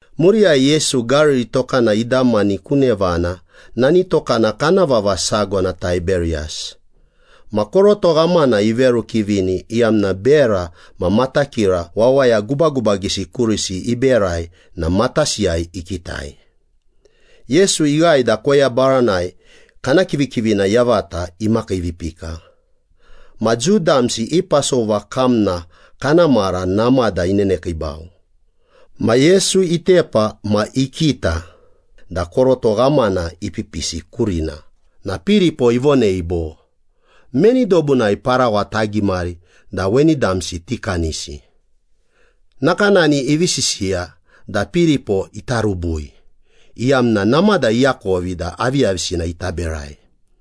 Muriyai Yesu, Gariri tokana idamani ku nevana. Nani tokana kana vava sago na Taiberiyas. Ma koroto ghamana iverukivini iyamna bera ma matakira wawaya gubagubagisi kurisi iberai na matasiyai ikitai. Yesu ighae da koya baranai kana kivikivina yavata imakiivipika. Ma Jiu damsi i Pasova kamna kana mara namada inenekiibau. Ma Yesu itepa ma ikita da koroto ghamana ipipisi kurina na Piripo ivonei bo, “Meni dobunai parawa tagimari da weni damsi tikanisi?” Nakanani ivi sisiya da Piripo ita rubui, iyamna namada iakovi da aviyavisina ita berai.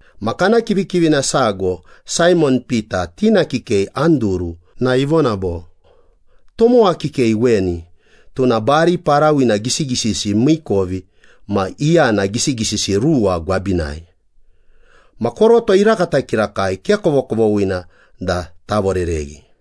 Ma kana kivikivina sago, Saimon Pita tina kikei Anduru na ivona bo, “Tomowa kikei weni, tuna bari parawina gisigisisi miikovi ma iyana gisigisisi ruwa gwabinai. Ma koroto irakata kirakai, ke kovokovoghina da tavorereghi.”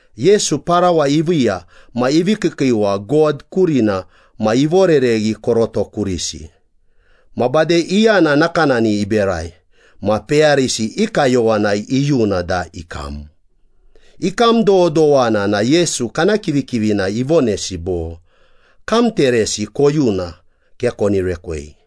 Yesu parawa iviiya ma ivi kiikiiwa God kurina ma ivorereghi koroto kurisi. Ma bade iyana nakanani iberai. Ma peyarisi i kayowanai iyuna da ikam. Ikam dododowana na Yesu kana kivikivina ivonesi bo, “Kamteresi koyuna, ke koni rekwei.”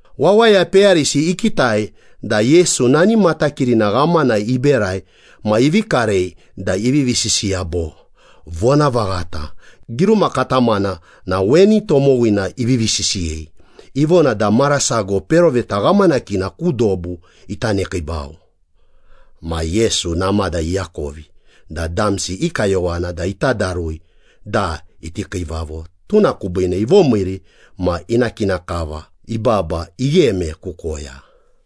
Wawaya peyarisi ikitai da Yesu nani matakirina ghamana iberai ma ivi karei da ivivi sisiya bo, “Vonavaghata, giruma katamana na weni tomowina ivivi sisiyei. Ivona da mara sago peroveta ghamanakina ku dobu ita nekiibau.” Ma Yesu namada iakovi da damsi i kayowana da ita darui da iti kiivavo, tuna kubiine ivomiiri ma ina kina kava ibaba igheme ku koya.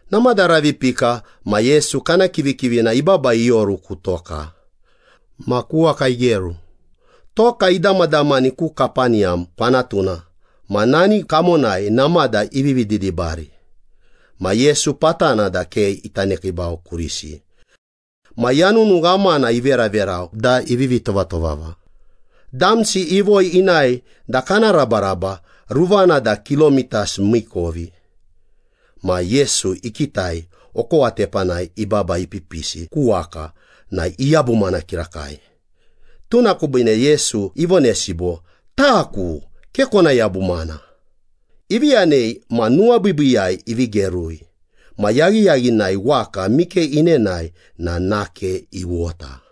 Namada ravi ipika, ma Yesu kana kivikivina ibaba ioru ku toka, ma ku waka igeru. Toka idamadamani ku Kapeniyam kwanatuna, ma nani kamonai namada ivi didibari. Ma Yesu patana da ke ita nekiibau kurisi. Ma yanunu ghamana iveraverau da ivivi tovatovava. Damsi ivoi inae da kana rabaraba, ruvana na kilomitas miikovi. Ma Yesu ikitai okowa tepanai ibaba ipipisi ku waka na iyabumana kirakai. Tuna kubiine Yesu ivonesi bo, “Taku. Ke kona yabumana.” Ivi yanei ma nuwabiibiiyai ivi gerui. Ma yaghiyaghinai waka mike enenae na nake iwota.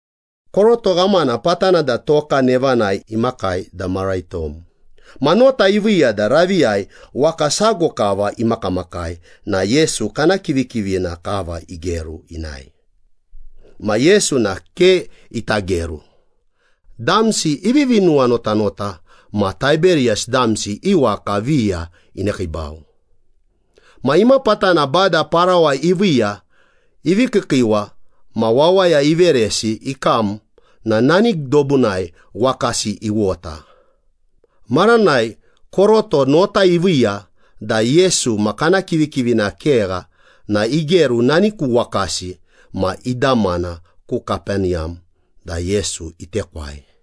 Koroto ghamana patana da toka nevanai imakai da mara itom. Ma nota iviiya da raviyai waka sago kava imakamakai na Yesu kana kivikivina kava igeru inae. Ma Yesu na ke ita geru. Damsi ivivi nuwanotanota ma Taiberiyas damsi i waka viya inekiibau. Ma imapatana Bada parawa iviiya, ivi kiikiiwa ma wawaya iveresi ikam na nani dobunai wakasi iwota. Maranai koroto nota iviiya da Yesu ma kana kivikivina kegha na igeru nani ku wakasi ma idamana ku Kapeniyam da Yesu itekwai.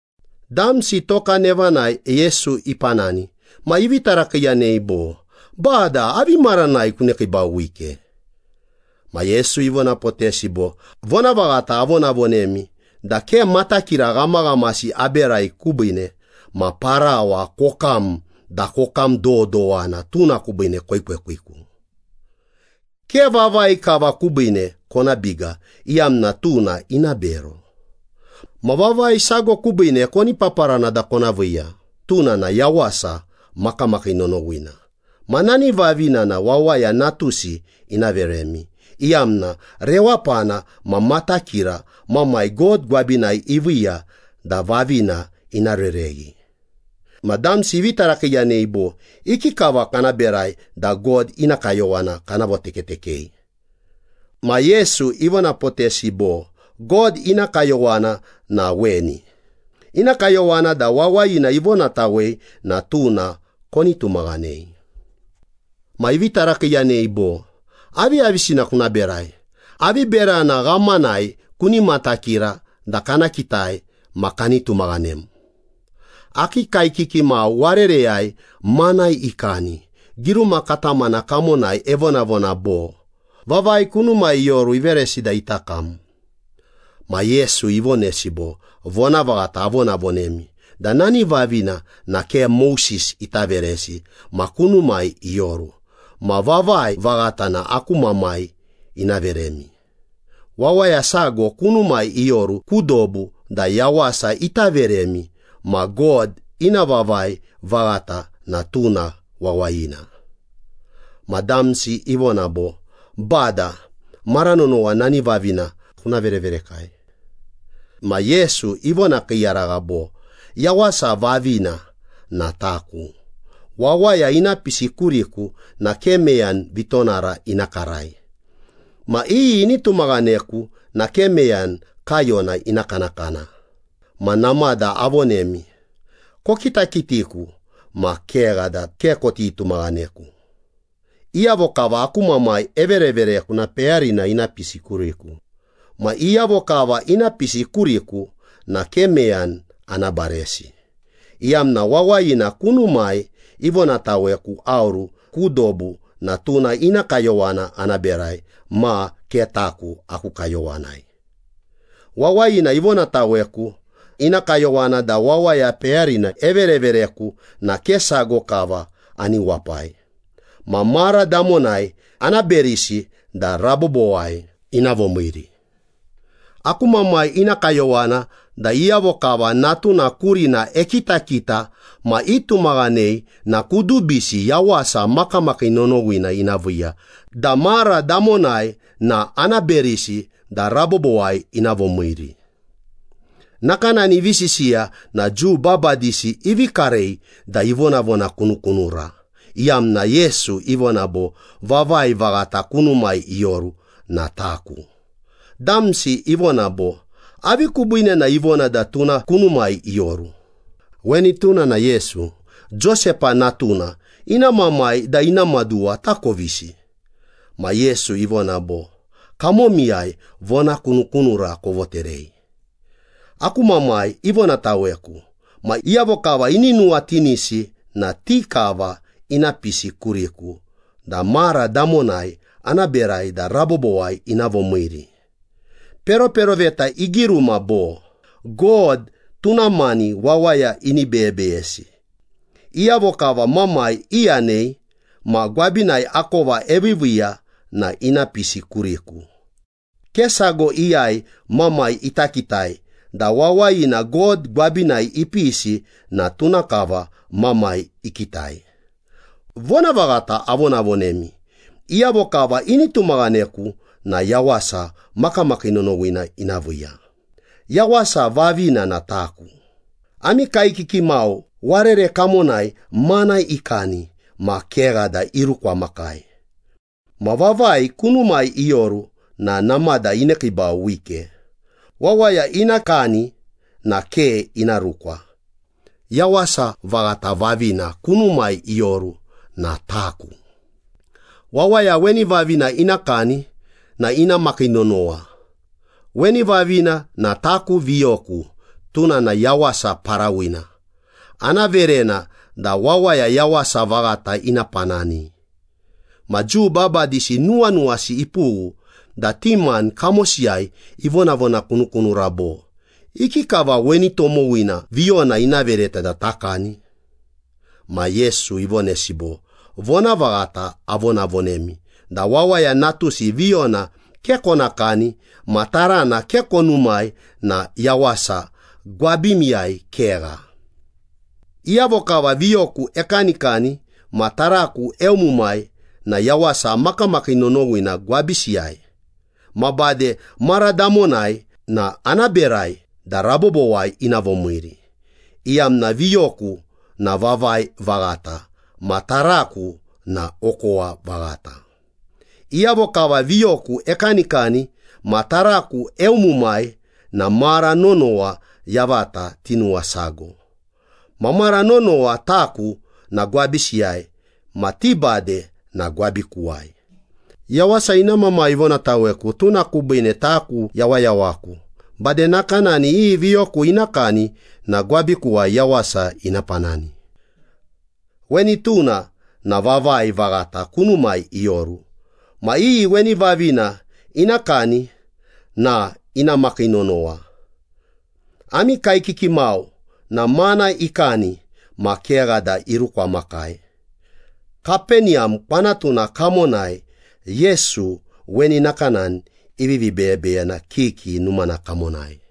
Damsi toka nevanai Yesu ipanani ma ivi tarakiiyanei bo, “Bada, avi maranai kunekiibau wike?” Ma Yesu ivonapotesi bo, “Vonavaghata avonavonemi da ke matakira ghamaghamasi aberai kubiine, ma parawa kokam da kokam dododowana, tuna kubiine koekwekwiku. Ke vavai kava kubiine kona biga iyamna tuna ina bero. Ma vavai sago kubiine koni paparana da kona viiya, tuna na yawasa makamakii nonowina. Ma nani vavina na Wawaya Natusi ina veremi, iyamna rewapana ma matakira Mamai God gwabinai iviiya da vavina ina rereghi.” Ma damsi ivi tarakiiyanei bo, “Ikikava kana berai da God ina kayowana kana votekatekei?” Ma Yesu ivonapotesi bo, “God ina kayowana na weni. Ina kayowana da wawayina ivonatawei na tuna koni tumaghanei.” Ma ivi tarakiiyanei bo, “Aviyavisina kuna berai? Avi berana ghamanai kuni matakira da kana kitai ma kani tumaghanem? Akii kaekiki mau warereyai mana ikani. Giruma katamana kamonai evonavona bo, ‘Vavai kunumai ioru, iveresi da ita kam.’” Ma Yesu ivonesi bo, “Vonavaghata avonavonemi da nani vavina na ke Moses ita veresi ma kunumai ioru. Ma vavai vaghata na aku Mamai ina veremi. Wawaya sago kunumai ioru ku dobu da yawasa ita veremi ma God ina vavai vaghata na tuna wawayina.” Ma damsi ivona bo, “Bada, mara nonowa nani vavina kuna vereverekai.” Ma Yesu ivonakiiyaragha bo, “Yawasa vavina na taku. Wawaya ina pisi kuriku na ke meyani vitonara ina karai, ma iyi ini tumaghaneku na ke meyani kaiyona ina kanakana. Ma namada avonemi, kokitakitiku ma kegha da ke koti tumaghaneku. Iyavo kava aku Mamai everevereku na peyarina ina pisi kuriku. Ma iyavo kava ina pisi kuriku na ke meyani ana baresi, iyamna wawayina kunumai ivonataweku aoru ku dobu na tuna ina kayowana ana berai ma ke taku aku kayowanai. Wawayina ivonataweku ina kayowana da wawaya peyarina everevereku na ke sago kava ani wapai. Ma mara damonai ana berisi da rabobowai ina vomiiri. Aku Mamai ina kayowana da iyavo kava Natuna kurina ekitakita ma itumaghanei na kudubisi yawasa makamakii nonowina ina viiya da mara damonai na ana berisi da rabobowai ina vomiiri.” Nakanani ivi sisiya na Jiu babadisi ivi karei da ivonavonakunukunura, iyamna Yesu ivona bo, “Vavai vaghata kunumai ioru na taku.” Damsi ivona bo, “Avi kubiine na ivona da tuna kunumai ioru? Weni tuna na Yesu, Josepa natuna. Ina mamai da ina maduwa takovisi.” Ma Yesu ivona bo, “Kamomiyai vonakunukunura kovoterei. Aku Mamai ivonataweku, ma iyavo kava ini nuwatinisi na ti kava ina pisi kuriku, da mara damonai ana berai da rabobowai ina vomiiri. Peroperoveta igiruma bo, ‘God tuna mani wawaya ini beyebeyesi.’ Iyavo kava Mamai iyanei ma gwabinai akova eviiviiya na ina pisi kuriku. Ke sago iyai Mamai ita kitai da wawayina God gwabinai ipisi na tuna kava Mamai ikitai. Vonavaghata avonavonemi, iyavo kava ini tumaghaneku na yawasa makamakii nonowina ina viiya. Yawasa vavina na taku. Ami kaekiki mau warere kamonai mana ikani, ma kegha da irukwamakai. Ma vavai kunumai ioru na namada inekiibau wike. Wawaya ina kani na ke ina rukwa. Yawasa vaghata vavina kunumai ioru na taku. Wawaya weni vavina ina kani na ina makii nonowa. Weni vavina na taku viyoku, tuna na yawasa parawina, ana verena da wawaya yawasa vaghata ina panani.” Ma Jiu babadisi nuwanuwasi ipughu da ti mani kamosiyai ivonavonakunukunura bo, “Ikikava weni tomowina viyona ina vereta da takani?” Ma Yesu ivonesi bo, “Vonavaghata avonavonemi da Wawaya Natusi viyona ke kona kani ma tarana ke konumai na yawasa gwabimiyai kegha. Iyavo kava viyoku ekanikani ma taraku eumumai na yawasa makamakii nonowina gwabisiyai ma bade mara damonai na ana berai da rabobowai ina vomiiri, iyamna viyoku na vavai vaghata ma taraku na okowa vaghata. Iyavo kava viyoku ekanikani ma taraku eumumai na mara nonowa yavata tinuwasago. Ma mara nonowa taku na gwabisiyai ma ti bade na gwabikuwai. Yawasa ina Mamai ivonataweku, tuna kubiine taku yawayawaku, bade nakanani iyi viyoku ina kani na gwabikuwai yawasa ina panani. Weni tuna na vavai vaghata kunumai ioru, ma iyi weni vavina ina kani na ina makii nonowa. Ami kaekiki mau na mana ikani ma kegha da irukwamakai.” Kapeniyam kwanatuna kamonai Yesu weni nakanani ivivi beyebeyena kiki numana kamonai.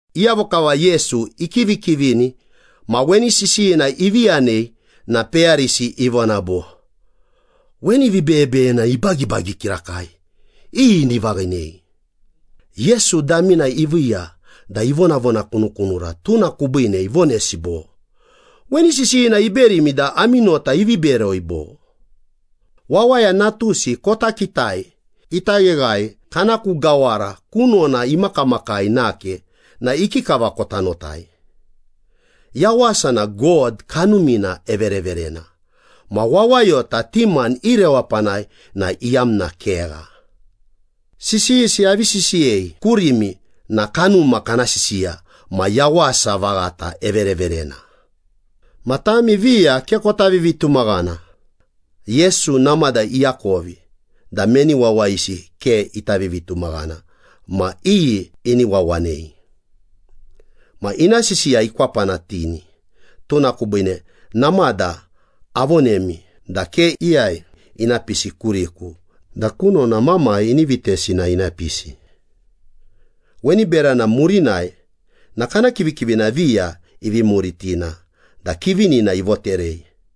Iyavo kava Yesu ikivikivini ma weni sisiyina ivi yanei na peyarisi ivona bo, “Weni vibeyebeyena ibagibagi kirakai! Iyi ini vaghinei?” Yesu damina iviiya da ivonavonakunukunura, tuna kubiine ivonesi bo, “Weni sisiyina iberimi na ami nota ivi beroi, bo? Wawaya Natusi kota kitai ita gheghae kana ku gawara kunona imakamakai nake na ikikava kota notai? Yawasa na God Kanumina evereverena ma wawayota ti mani i rewapana na iyamna kegha. Sisiyisi avi sisiyei kurimi na Kanuma kana sisiya ma yawasa vaghata evereverena. Ma tami viya ke kota vivitumaghana.” Yesu namada iakovi da meni wawayisi ke ita vivitumaghana ma iyi ini wawanei. Ma ina sisiya ikwapanatini, “Tuna kubiine namada avonemi da ke iyai ina pisi kuriku da kunona Mamai ini vitesi na ina pisi.” Weni berana murinai na kana kivikivina viya ivi muritina da kivinina ivoterei.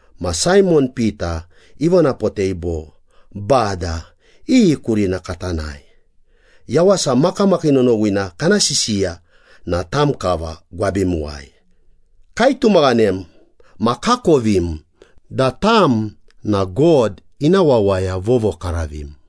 Ma Saimon Pita ivonapotei bo, “Bada, iyi kurina kata nae? Yawasa makamakii nonowina kana sisiya na tam kava gwabimuwai. Kaitumaghanem ma kakovim da tam na God ina Wawaya Vovokaravim.”